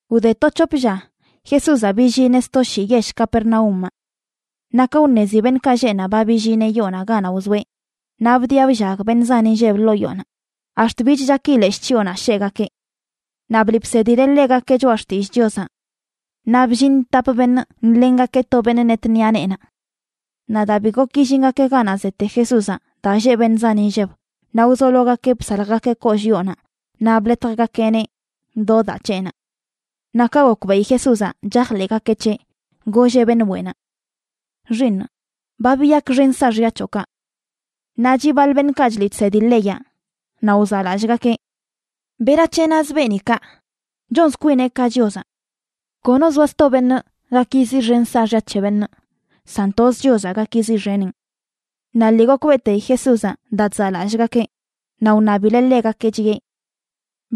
Wde to c̱hop lla, Jesúzaꞌ billineꞌ sto shii yell Capernaúmaꞌ. Naꞌ ka wṉezi beṉꞌkaꞌ lleꞌ naꞌ ba billineꞌ yoonaꞌ ganaꞌ wzoeꞌ, naꞌ bdiꞌa bllag beṉꞌ zan inlleb ḻoo yoonaꞌ ax̱t bich chaki leshꞌ chyoonaꞌ sheꞌgakeꞌ. Naꞌ bliꞌ bsedileꞌ ḻegakeꞌ choꞌa xtillꞌ Chiozaꞌ. Naꞌ bllin tap beṉꞌ nḻengakeꞌ to beṉꞌ net ṉiꞌa neenaꞌ. Naꞌ daa bi gok illingakeꞌ ganaꞌ zete Jesúzaꞌ daa lleꞌ beṉꞌ zan inlleb, naꞌ wzologakeꞌ bsaljgakeꞌ kollꞌ yoonaꞌ naꞌ bḻetjgakeꞌneꞌ do daa c̱heꞌnaꞌ. Naꞌ ka gokbeꞌi Jesúzaꞌ chajḻeꞌgakeꞌ c̱heꞌ, golleꞌ beṉꞌ weꞌnaꞌ: ―Xiiṉ, ba biyakxen saaxya c̱hoꞌkaꞌ. Naꞌ chiꞌ baḻ beṉꞌkaꞌ chliꞌ chsedi leyaꞌ, naꞌ wzaꞌlallꞌgakeꞌ: “¿Berac̱he naz beeni kaꞌ? Chonz kwineꞌ ka Chiozaꞌ. Kono zoa sto beṉꞌ gak yiziꞌxen saaxya c̱he beṉꞌ, san toz Chiozaꞌ gak yiziꞌxeneꞌn.” Naꞌ lii gokbeꞌteyi Jesúzaꞌ daa chzaꞌlallꞌgakeꞌ, naꞌ wṉabileꞌ ḻegakeꞌ, chiꞌe: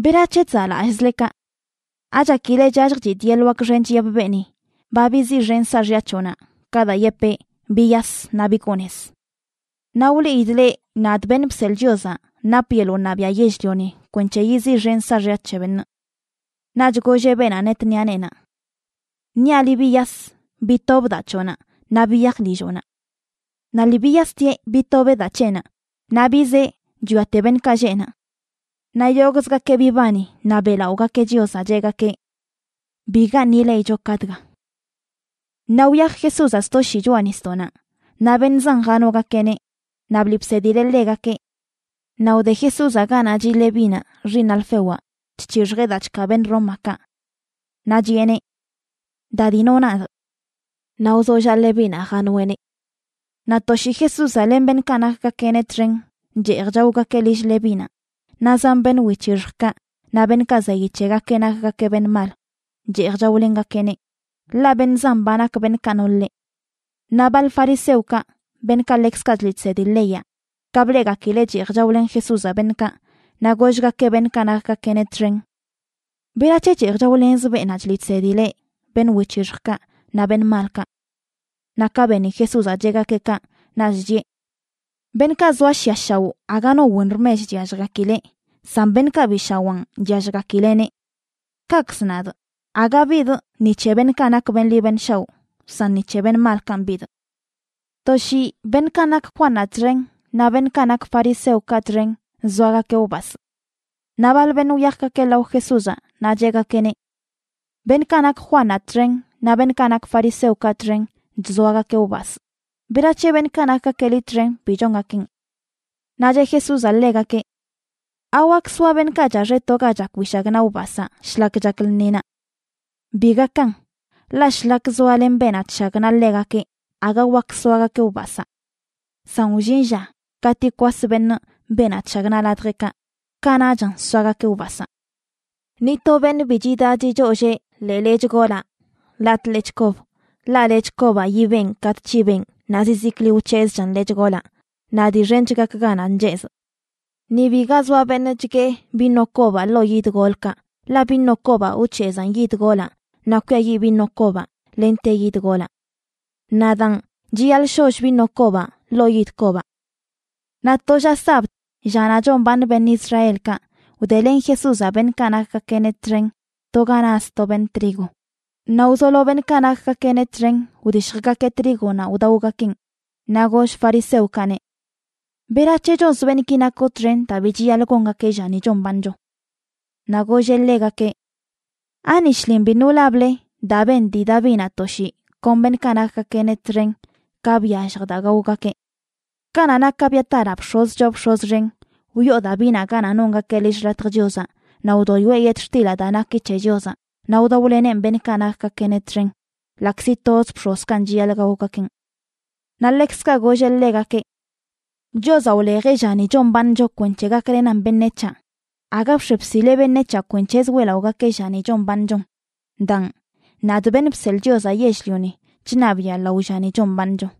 ―¿Berac̱he chzaꞌlallꞌzle kaꞌ? ¿Achakile chyalljchidꞌ yeḻꞌ wak xench yepꞌ beeni: “Ba biziꞌxenꞌ saaxya c̱hoꞌnaꞌ”, ka daa yepee: “Biyas naꞌ bigoo nez”? Naꞌ wliidꞌ leꞌ, nadꞌ Beṉꞌ Bseḻꞌ Chiozaꞌ napꞌ yeḻꞌ wṉabiaꞌ yell-lioni kwenc̱he yiziꞌxenꞌ saaxya c̱he beṉꞌ. Naꞌch golleꞌ beenaꞌ net ṉiꞌa neenaꞌ: ―Niaꞌ liꞌ, biyas, bitob daa c̱hoꞌnaꞌ, naꞌ biyaj lilloꞌnaꞌ. Naꞌ lii biyastieꞌ bitobeꞌ daa c̱heꞌnaꞌ naꞌ bizee chwiate beṉꞌkaꞌ lleꞌ naꞌ. Naꞌ yogꞌzgakeꞌ bibani naꞌ beꞌlaꞌogakeꞌ Chiozaꞌ, cheꞌgakeꞌ: ―Bigaṉꞌ ileꞌicho ka dga. Naꞌ wyaj Jesúzaꞌ sto shii choꞌa nisdoꞌnaꞌ naꞌ beṉꞌ zan janogakeꞌneꞌ, naꞌ bliꞌ bsedileꞌ ḻegakeꞌ. Naꞌ wde Jesúzaꞌ ganaꞌ chiꞌ Levínaꞌ, xiiṉ Alfewaꞌ, chc̱hixjeꞌ daa chkaa beṉꞌ Rómakaꞌ. Naꞌ chiꞌeneꞌ: ―Da, dino nadꞌ. Naꞌ wzollaꞌ Levínaꞌ janoeꞌneꞌ. Naꞌ to shii Jesúzaꞌ len beṉꞌkaꞌ nakgakeꞌneꞌ txen cheej chaogakeꞌ lill Levínaꞌ, naꞌ zan beṉꞌ wic̱hixjkaꞌ naꞌ beṉꞌkaꞌ zeyi c̱hegakeꞌ nakgakeꞌ beṉꞌ mal cheej chaolengakeꞌneꞌ, ḻaꞌ beṉꞌ zan ba nak beṉꞌkaꞌ no ḻeꞌ. Naꞌ baḻ fariseokaꞌ, beṉꞌkaꞌ ḻekzkaꞌ chliꞌ chsedi leyaꞌ, ka bleꞌgakileꞌ cheej chaolen Jesúzaꞌ beṉꞌkaꞌ, naꞌ gollgakeꞌ beṉꞌkaꞌ nakgakeꞌneꞌ txen: ―¿Berac̱he cheej chaolenz beenaꞌ chliꞌ chsedi leꞌ beṉꞌ wic̱hixjkaꞌ naꞌ beṉꞌ malkaꞌ? Naꞌ ka beni Jesúzaꞌ cheꞌgakeꞌ kaꞌ, naꞌch chiꞌe: ―Beṉꞌkaꞌ zoa shiꞌa shaoꞌ aga no wen rmech chyalljgakileꞌ, san beṉꞌkaꞌ bi shawaan chyalljgakileꞌneꞌ. Kaꞌkzə nadꞌ, aga bidꞌ ni c̱he beṉꞌkaꞌ nak beṉꞌ ḻi beṉꞌ shaoꞌ, san ni c̱he beṉꞌ malkanꞌ bidꞌ. To shii beṉꞌkaꞌ nak Juannaꞌ txen naꞌ beṉꞌkaꞌ nak fariseokaꞌ txen chzoagakeꞌ wbasꞌ. Naꞌ baḻ beṉꞌ wyajgakeꞌ lao Jesúzaꞌ naꞌ cheꞌgakeꞌneꞌ: ―Beṉꞌkaꞌ nak Juannaꞌ txen naꞌ beṉꞌkaꞌ nak fariseokaꞌ txen chzoagakeꞌ wbasꞌ. ¿Berac̱he beṉꞌkaꞌ nakgakeꞌ liꞌ txen bi chongakeꞌn? Naꞌ cheꞌ Jesúzaꞌ ḻegakeꞌ: ―¿Awak soa beṉꞌkaꞌ chaxeꞌ to ga chak wishagnaꞌ wbasaa shlak chak lṉinaꞌ? Bi gakan, ḻaꞌ shlak zoalen beenaꞌ chshagnaꞌ ḻegakeꞌ aga wak soagakeꞌ wbasaa. San wllin lla katꞌ yikwas beṉꞌ beenaꞌ chshagnaꞌ ladjeꞌkaꞌ, kanaꞌchan soagakeꞌ wbasaa. ’Ni to beṉꞌ bi chidaꞌ chichollee ḻee lechꞌ golaꞌ latꞌ lechꞌ kob, ḻaꞌ lechꞌ kobaꞌ yibeꞌn katꞌ c̱hibeꞌn naꞌ zizikli wc̱hezꞌchan lechꞌ golaꞌ, naꞌ dii xench gak ganaꞌ nchezꞌ. Ni biga zoa beṉꞌ chguee vino kobaꞌ ḻoo yid golkaꞌ, ḻaꞌ vino kobaꞌ wc̱hezaan yid golaꞌ naꞌ kwiayiꞌ vino kobaꞌ lente yid golaꞌ. Naꞌ daan, chiyaḻꞌ sholl vino kobaꞌ ḻoo yid kobaꞌ. Naꞌ to lla sabd, llanaꞌ chombaaṉ beṉꞌ Israelkaꞌ, wdelen Jesúzaꞌ beṉꞌkaꞌ nakgakeꞌneꞌ txen to ga naz to beṉꞌ trigo, naꞌ wzolo beṉꞌkaꞌ nakgakeꞌneꞌ txen wdishjgakeꞌ trígonaꞌ wdaogakeꞌn. Naꞌ goll fariseokaꞌneꞌ: ―¿Berac̱he chonz beṉꞌki nakoꞌ txen daa bi chiyaḻꞌ gongakeꞌ llani chombaaṉcho? Naꞌ golleꞌ ḻegakeꞌ: ―¿Ani shlin biṉꞌ wlable daa ben dii Davinaꞌ to shii kon beṉꞌkaꞌ nakgakeꞌneꞌ txen ka byallj daa gaogakeꞌ? Kanaꞌ nak Abiataraꞌ bx̱oz choo bx̱oz xen, wyoo Davinaꞌ ganaꞌ nongakeꞌ lill xḻatjə Chiozaꞌ naꞌ wdoyoeꞌ yetxtilaꞌ daa naki c̱he Chiozaꞌ naꞌ wdaoleneꞌn beṉꞌkaꞌ nakgakeꞌneꞌ txen, ḻaꞌkzi toz bx̱ozkanꞌ chiyaḻꞌ gaogakeꞌn. Naꞌ ḻekzkaꞌ golleꞌ ḻegakeꞌ: ―Chiozaꞌ wlejeꞌ llani chombaaṉcho kwenc̱he gaklenan beṉec̱haꞌ, aga bx̱e bsileꞌ beṉec̱haꞌ kwenc̱hezə weꞌlaꞌogakeꞌ llani chombaaṉchon. Daan, nadꞌ, Beṉꞌ Bseḻꞌ Chiozaꞌ Yell-lioni, chṉabiꞌa lao llani chombaaṉcho.